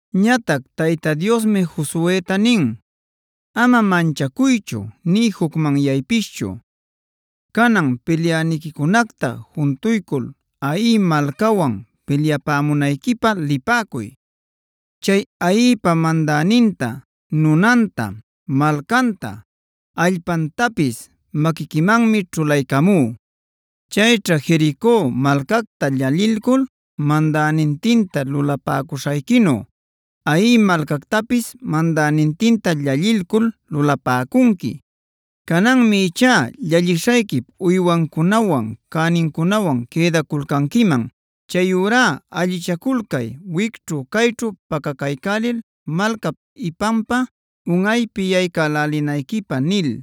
Ñatac Tayta Diosmi Josueta nin: “Ama manchacuychu nï jucmanyaypischu. Canan pilyäniquicunacta juntuycul Hai malcawan pilyapämunayquipä lipäcuy. Chay Haipa mandäninta, nunanta, malcanta, allpantapis maquiquimanmi ćhulaycamú. Chayćha Jerico malcacta llallilcul mandänintinta lulapäcuśhayquinu, Hai malcactapis mandänintinta llallilcul lulapäcunqui. Cananmi ichá llallishayquip uywancunawan, cänincunawan quïdaculcanquiman. Chayurá allichaculcay wicćhu-cayćhu pacacaycälil malcap ipanpa unꞌaypi yaycälälinayquipä” nil.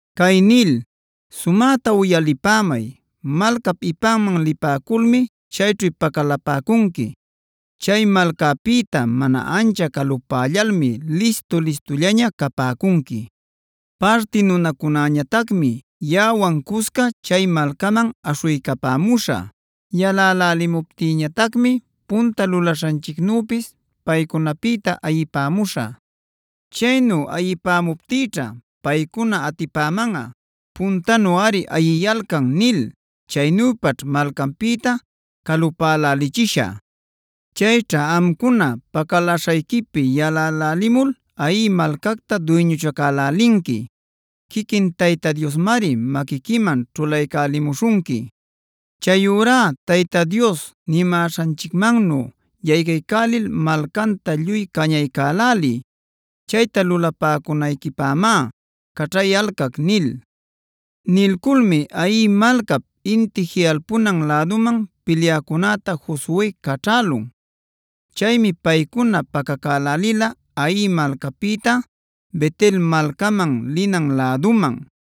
cay nil: “Sumäta uyalipämay, malcap ipanman lipäculmi chayćhu pacalapäcunqui. Chay malcapïta mana ancha calupällalmi listu-listullaña capäcunqui. Parti nunacunäñatacmi yaꞌawan cusca chay malcaman aśhuycapämuśhä. Yalälälimuptinñatacmi punta lulaśhanchicnüpis paycunapïta ayipämuśhä. Chaynu ayipämuptïćha paycuna atipämanꞌa: ‘Puntanuꞌari ayiyalcan’ nil. Chaynüpaćh malcanpïta calupälälichishä. Chayćha amcuna pacaläśhayquipi yalalcälimul Hai malcacta duyñuchacaycälinqui. Quiquin Tayta Diosmari maquiquiman ćhulaycälimuśhunqui. Chayurá Tayta Dios nimäśhanchicmannu yaycaycälil malcanta lluy cañaycäläliy. Chayta lulapäcunayquipämá caćhayalcac” nil. Nilculmi Hai malcap inti jiꞌalpunan läduman pilyäcunäta Josue caćhälun. Chaymi paycuna pacacälälila Hai malcapïta Bet-el malcaman linan läduman.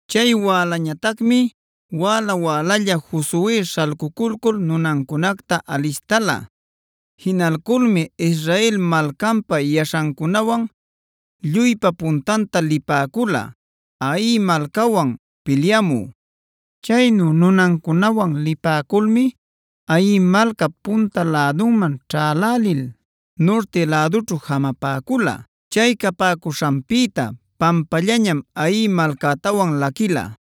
Chay wälañatacmi wäla-wälalla Josue śhalcuculcul nunancunacta alistala. Jinalculmi Israel malcanpa yaśhancunawan lluypa puntanta lipäcula, Hai malcawan pilyamü. Chaynu nunancunawan lipäculmi Hai malcap punta lädunman ćhälälil, nurti lädućhu jamapäcula. Chay capäcuśhanpïta pampallañam Hai malcätawan laquila.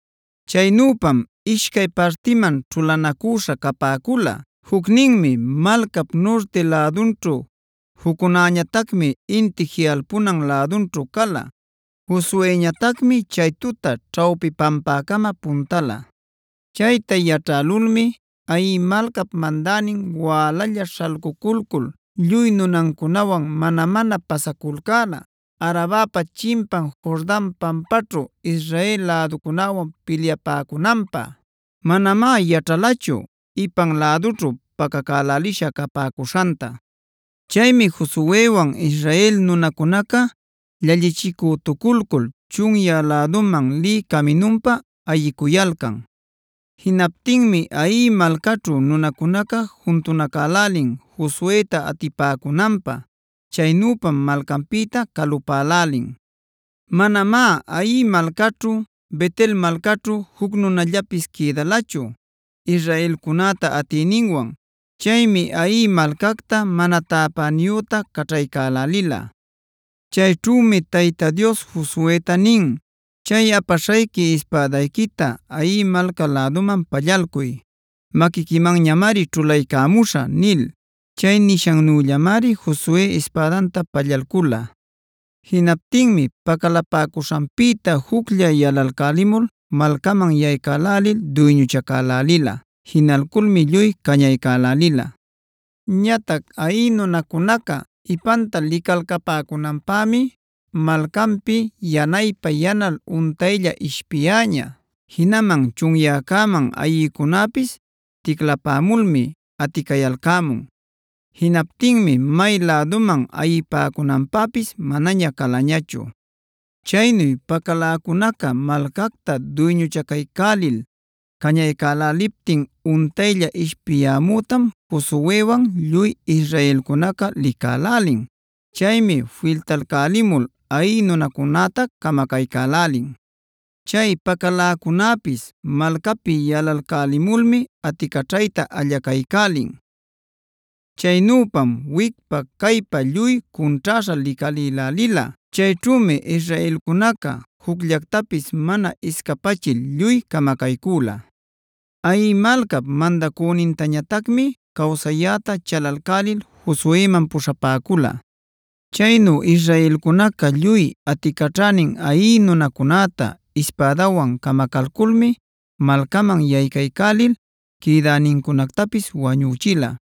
Chaynüpam ishcay partiman ćhulanacüśha capäcula: Jucninmi malcap nurti lädunćhu, juccunäñatacmi inti jiꞌalpunan lädunćhu cala. Josueñatacmi chay tuta ćhawpi pampäcama puntala. Chayta yaćhälulmi Hai malcap mandänin wälalla śhalcuculcul lluy nunancunawan mana-mana pasaculcäla Arabapa chimpan Jordan pampaćhu Israel läducunäwan pilyapäcunanpä. Manamá yaćhalachu ipan lädućhu pacacälälisha capäcuśhantá. Chaymi Josuewan Israel nunacunaca llallichicütuculcul chunyä läduman lï caminunpä ayicuyalcan. Jinaptinmi Hai malcaćhu nunacunaca juntunacälälin Josueta atipäcunanpä. Chaynüpam malcanpïta calupälälin. Manamá Hai malcaćhu, Bet-el malcaćhu juc nunallapis quïdalachu israelcunäta atiyninwan. Chaymi Hai malcacta mana täpäniyüta caćhaycälälila. Chayćhümi Tayta Dios Josueta nin: “Chay apaśhayqui ispädayquita Hai malca läduman pallalcuy; maquiquimanñamari ćhulaycamuśhä” nil. Chay nishannüllamari Josue ispädanta pallalcula. Jinaptinmi pacalapäcuśhanpïta juclla yalalcälimul malcaman yaycaycälil duyñuchacälälila. Jinalculmi lluy cañaycälälila. Ñatac Hai nunacunaca ipanta licalcapäcunanpämi malcanpi yanaypa-yanal untaylla ishpiyäña. Jinaman chunyäcäman ayïcunäpis ticlapämulmi aticayalcämun. Jinaptinmi may läduman ayipäcunanpäpis manaña calañachu. Chaynu pacaläcunaca malcacta duyñuchacaycälil cañaycäläliptin untaylla ishpiyämütam Josuewan lluy israelcunaca licälälin. Chaymi filtalcälimul Hai nunacunäta camacaycälälin. Chay pacaläcunäpis malcapi yalalcälimulmi aticaćhayta allacaycälin. Chaynüpam wicpa-caypa lluy cunćhäśhaa licalïlälila. Chayćhümi israelcunaca jucllactapis mana iscapachil lluy camacaycüla. Hai malcap mandacünintañatacmi cawsayäta chalalcälil Josueman puśhapäcula. Chaynu israelcunaca lluy aticaćhänin Hai nunacunäta ispädawan camacalculmi malcaman yaycaycälil quïdänincunactapis wañüchila.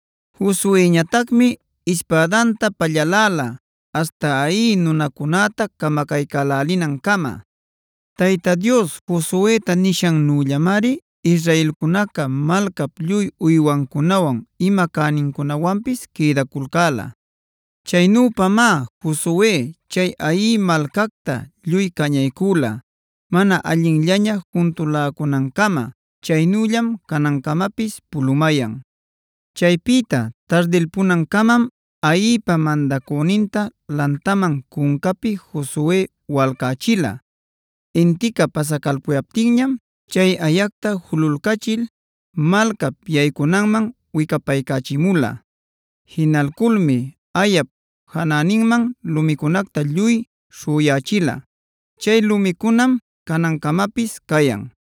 Josueñatacmi ispädanta pallaläla aśhta Hai nunacunäta camacaycälälinancama. Tayta Dios Josueta nishannüllamari israelcunaca malcap lluy uywancunawan, ima cänincunawanpis quïdaculcäla. Chaynüpamá Josue chay Hai malcacta lluy cañaycüla mana allinllaña juntuläcunancama. Chaynüllam canancamapis pulumayan. Chaypïta tardilpunancamam Haipa mandacüninta lantamanb cuncapi Josue walcächila. Intica pasacalpuyaptinñam chay ayacta jululcachil malcap yaycunanman wicapaycächimula. Jinalculmi ayap janäninman lumicunacta lluy śhüyächila.c Chay lumicunam canancamapis cayan.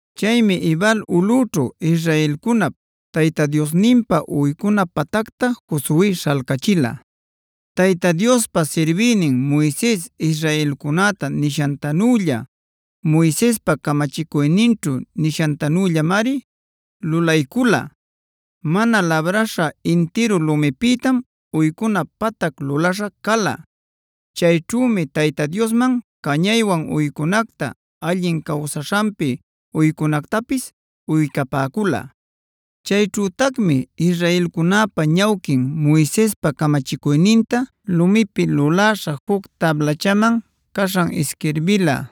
Chaymi Ebal ulꞌućhu israelcunap Tayta Diosninpa uycuna patacta Josue śhalcachila. Tayta Diospa sirbïnin Moises israelcunäta nishantanülla, Moisespa camachicuyninćhu nishantanüllamari lulaycula: Mana labräśha intirun lumipïtam uycuna patac luläśha cala.d Chayćhümi Tayta Diosman cañaywan uycunacta, allin cawsaśhanpi uycunactapis uycapäcula. Chayćhütacmi israelcunäpa ñawquin Moisespa camachicuyninta lumipi luläśha juc tablachaman caśhan isquirbila.e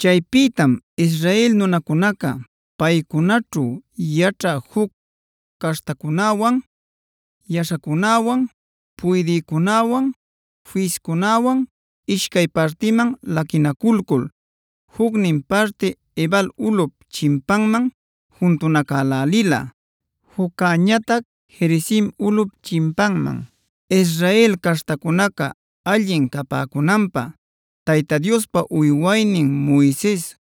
Chaypïtam Israel nunacunaca, paycunaćhu yaćhä juc caśhtacunäwan, yaśhacunäwan, puydïcunäwan, fiscunäwan ishcay partiman laquinaculcul, jucnin parti Ebal ulꞌup chimpanman juntunacälälila, juccäñatac Gerizim ulꞌup chimpanman. Israel caśhtacunaca allin capäcunanpä Tayta Diospa uywaynin Moises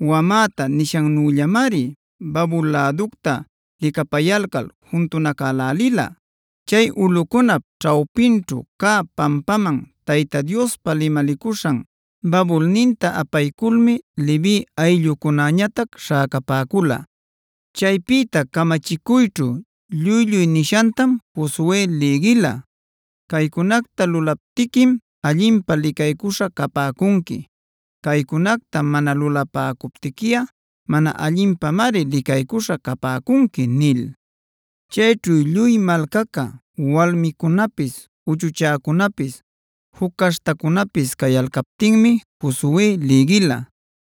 wamäta nishannüllamari babul läducta licapayalcal juntunacälälila. Chay ulꞌucunap ćhawpinćhu cä pampaman Tayta Diospa limalicuśhan babulninta apayculmi Levi ayllucunäñatac śhäcapäcula. Chaypïta camachicuyćhu lluy-lluy nishantam Josue lïgila: “Caycunacta lulaptiquim allinpä licaycuśha capäcunqui; caycunacta mana lulapäcuptiquiꞌa mana allinpämari licaycuśha capäcunqui” nil. Chayćhu lluy malcaca, walmicunapis, uchuchäcunapis, juc caśhtacunäpis cayalcaptinmi Josue lïgila.